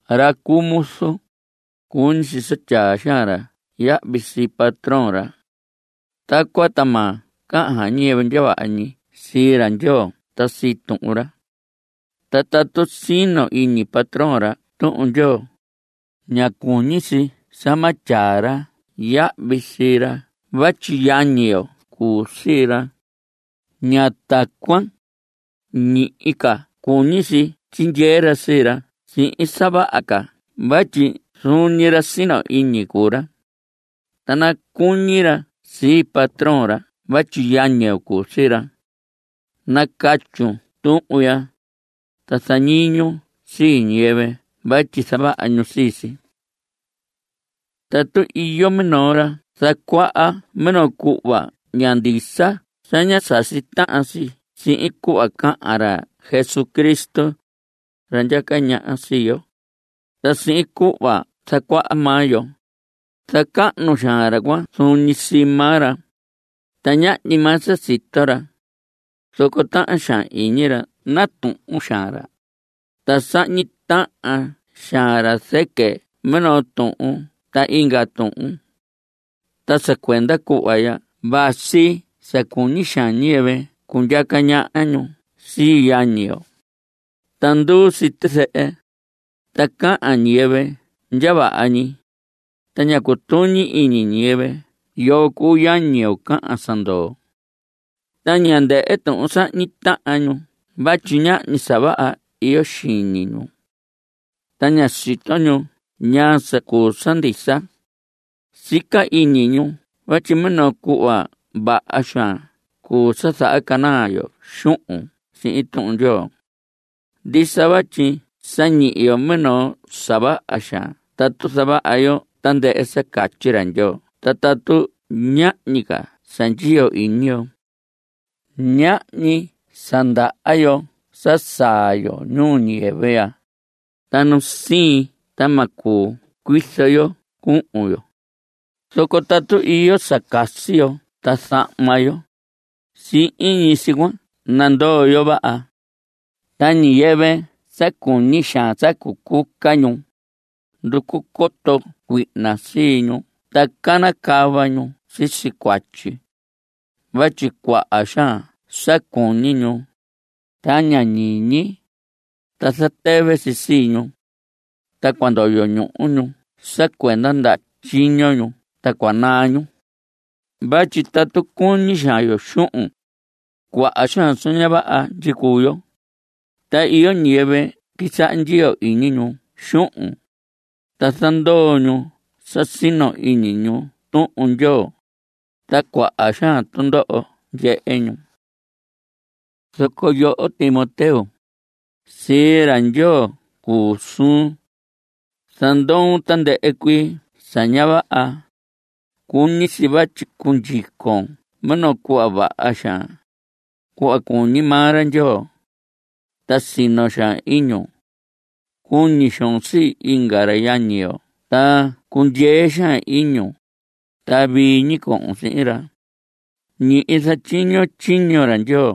Ra cuu muzu, cuñi si sa tyaa xaan ra yahvi sii patrón ra. Tacuan ta ma cahan ñiyɨvɨ ndya vaha ñi sii ra Ndyoo ta sii Tuhun ra. Ta tatu sino iñi patrón ra Tuhun Ndyoo, ña cuñi si sa ma tyaa ra yahvi sii ra vatyi yañi yo cuu sii ra. Ña tacuan. Ñihi ca cuñi si tyindyee ra sii ra sihin sa vaha ca vatyi zuun ñi ra sino iñi cuu ra. Ta nacuñi ra sii patrón ra vatyi yañi yo cuu sii ra. Nacatyun tuhun ya, ta zañiñun sii ñiyɨvɨ vatyi zavaha ñu sii si. Tatu iyo minoo ra zacuaha minoo cuhva ña ndisa ta ña sasi tahan si sihin cuhva cahan ra Jesucristo, ra ndyaca ñaha sii yo, ta sihin cuhva zacuaha maa yo, zacahnu xaan ra cuan zuun ñi sii maa ra, ta ñahñi maa sa sito ra. Zoco tahan xaan iñi ra natuhun xaan ra, ta sahñi tahan xaan ra zɨquɨ minoo tuhun ta inga tuhun. Ta sa cuenda cuhva ya vasi sa cuñi xaan ñiyɨvɨ cundyaca ñaha ñu sii yañi yo. Ta nduu si tizɨhɨ, ta cahan ñiyɨvɨ ndya vaha ñi, ta ña cutuñi iñi ñiyɨvɨ yoo cuu yañi yo cahan sa ndoo. Ta ña ndɨhɨ tuhun sahñi tahan ñu vatyi ñahñi sa vaha iyo xiñi ñu. Ta ña sito ñu ñaa sa cuu sa ndisa. Sica iñi ñu vatyi minoo cuhva vaha xaan cuu sa zahacanaa yo xuhun sihin Tuhun Ndyoo. Ndisa vatyi sa ñihi yo minoo sa vaha xaan tatu zavaha yo tandɨhɨ sa catyi ra Ndyoo ta tatu ñahñi ca sa ndyiyo iñi yo. Ñahñi sa ndaha yo sa saa yo ñuu ñiyɨvɨ ya, ta nu siin ta ma cuu cuizo yo cuhun yo. Zoco tatu iyo sa casi yo ta zahma yo, sihin ñi si cuan nandoo yo vaha. Ta ñiyɨvɨ sa cuñi xaan sa cucuca ñu, nducu coto cuihna sii ñu ta canacava ñu sisi cuatyi. Vatyi cuaha xaan sa cuñi ñu, ta ña ñiñi, ta zatɨvɨ si sii ñu. Ta cua ndoyo ñuhu ñu sa cuenda ndaha tyiño ñu ta cua naa ñu. Vatyi tatu cuñi xaan yo xuhun, cuaha xaan sa ña vaha ndyicuu yo. Ta iyo ñiyɨvɨ quisaha ndyiyo iñi ñu xuhun, ta zandoo ñu sa sino iñi ñu Tuhun Ndyoo, ta cuaha xaan tundoho ndyehe ñu. Zoco yoho Timoteo, sii ra Ndyoo cuu suun. Zandoon tandɨhɨ cuii sa ña vaha. Cuñi si vatyi cundyicon minoo cuhva vaha xaan, cuhva cuñi maa ra Ndyoo. Ta sino xaan iñun. Cuñi xoon sii inga ra yañi yo ta cundyee xaan iñun. Ta vii ñi cohon sihin ra. Ñihi zatyiñon tyiño ra Ndyoo.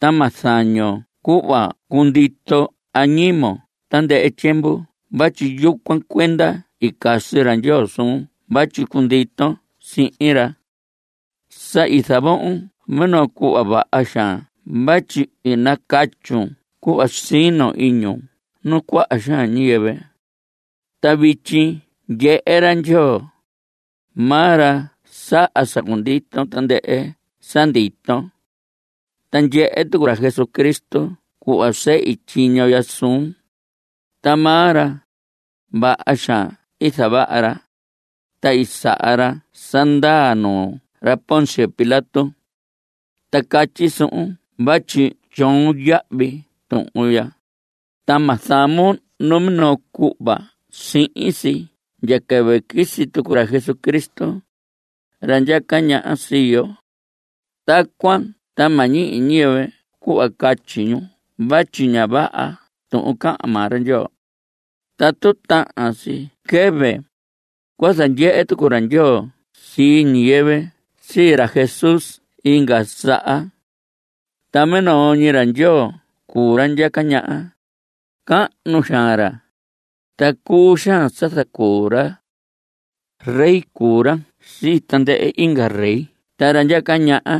Ta ma zañon cuhva cundito añimon tandɨhɨ tyiemvu vatyi yucuan cuenda i casi ra Ndyoo suun vatyi cunditon sihin ra. Sa i zavohon minoo cuhva vaha xaan vatyi i nacatyun cuhva sino iñun nuu cuaha xaan ñiyɨvɨ. Ta vityi ndyehe ra Ndyoo. Maa ra saha sa cundito tandɨhɨ sa ndito. Ta ndyehe tucu ra Jesucristo cuhva sehi tyiño ya suun. Ta maa ra, vaha xaan i zavaha ra, ta i saha ra sa ndaa nuu ra Poncio Pilato. Ta catyi suhun vatyi tyoon yahvi tuhun ya, ta ma zamon numinoo cuhva sihin si ndya quɨvɨ quisi tucu ra Jesucristo, ra ndyaca ñaha sii yo. Tacuan ta ma ñihi ñiyɨvɨ cuhva catyi ñu vatyi ña vaha tuhun cahan maa ra Ndyoo. Tatu tahan si quɨvɨ, cua zandyehe tucu ra Ndyoo sii ñiyɨvɨ sii ra Jesús inga saha. Ta minoo ñi ra Ndyoo cuu ra ndyaca ñaha. Cahnu xaan ra, ta cuu xaan sa zacuu ra. Rey cuu ra sii tandɨhɨ inga rey ta ra ndyaca ñaha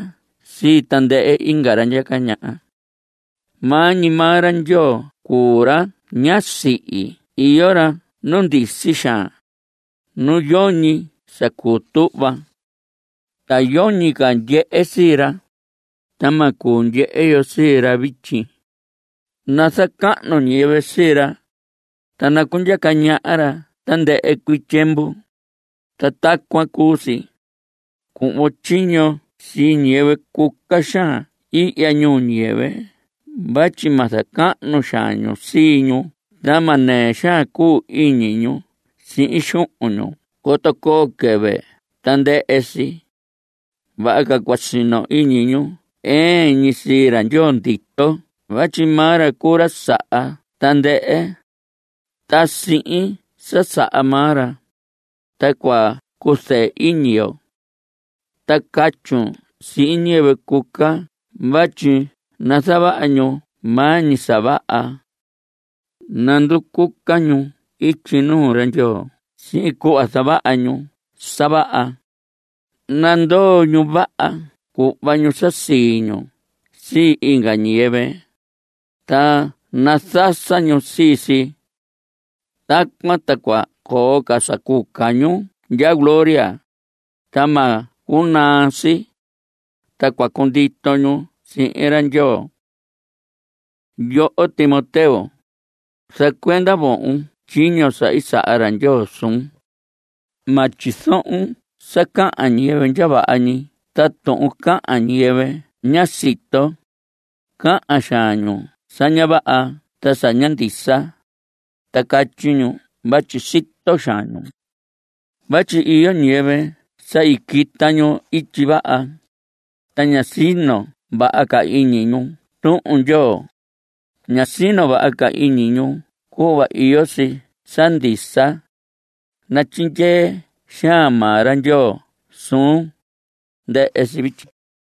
sii tandɨhɨ inga ra ndyaca ñaha. Maa ñi maa ra Ndyoo cuu ra ña sihi. Iyo ra nu ndisi xaan, nu yoñi sa cuu tuhva. Ta yoñi ca ndyehe sii ra, ta ma cuu ndyehe yo sii ra vityi. Nazacahnu ñiyɨvɨ sii ra, ta nacundyaca ñaha ra tandɨhɨ cuii tyiemvu. Ta tacuan cuu si. Cuhvon tyiño sii ñiyɨvɨ cuca xaan ihya ñuu ñiyɨvɨ vatyi ma zacahnu xaan ñu sii ñu ta ma nɨɨ xaan cuu iñi ñu sihin xuhun ñu coto coo quɨvɨ ta ndɨhɨ si. Vaha ca cua sino iñi ñu ɨɨn ñi sii ra Ndyoo ndito vatyi maa ra cuu ra saha tandɨhɨ. Ta sihin sa saha maa ra, ta cua cuzɨɨ iñi yo. Ta catyun sihin ñiyɨvɨ cuca vatyi nazavaha ñu maa ñi sa vaha. Nanducuca ñu ityi nuu ra Ndyoo sihin cuhva zavaha ñu sa vaha. Nandoo ñu vaha cuhva ñu sa sii ñu sii inga ñiyɨvɨ, ta nazasa ñu sii si. Tacuan ta cua coo sa cuca ñu ndya gloria, ta ma cunaa si. Ta cua cundito ñu sihin ra Ndyoo. Yoho Timoteo, zacuenda vohon tyiño sa i saha ra Ndyoo suun. Ma tyizohon sa cahan ñiyɨvɨ ndya vaha ñi ta tuhun cahan ñiyɨvɨ ña sito. Cahan xaan ñu sa ña vaha ta sa ña ndisa, ta catyi ñu vatyi sito xaan ñu. Vatyi iyo ñiyɨvɨ sa i quita ñu ityi vaha. Ta ña sino vaha ca iñi ñu Tuhun Ndyoo. Ña sino vaha ca iñi ñu cuhva iyo si sa ndisa. Natyindyee xaan maa ra Ndyoo suun. Ndɨhɨ si vityi.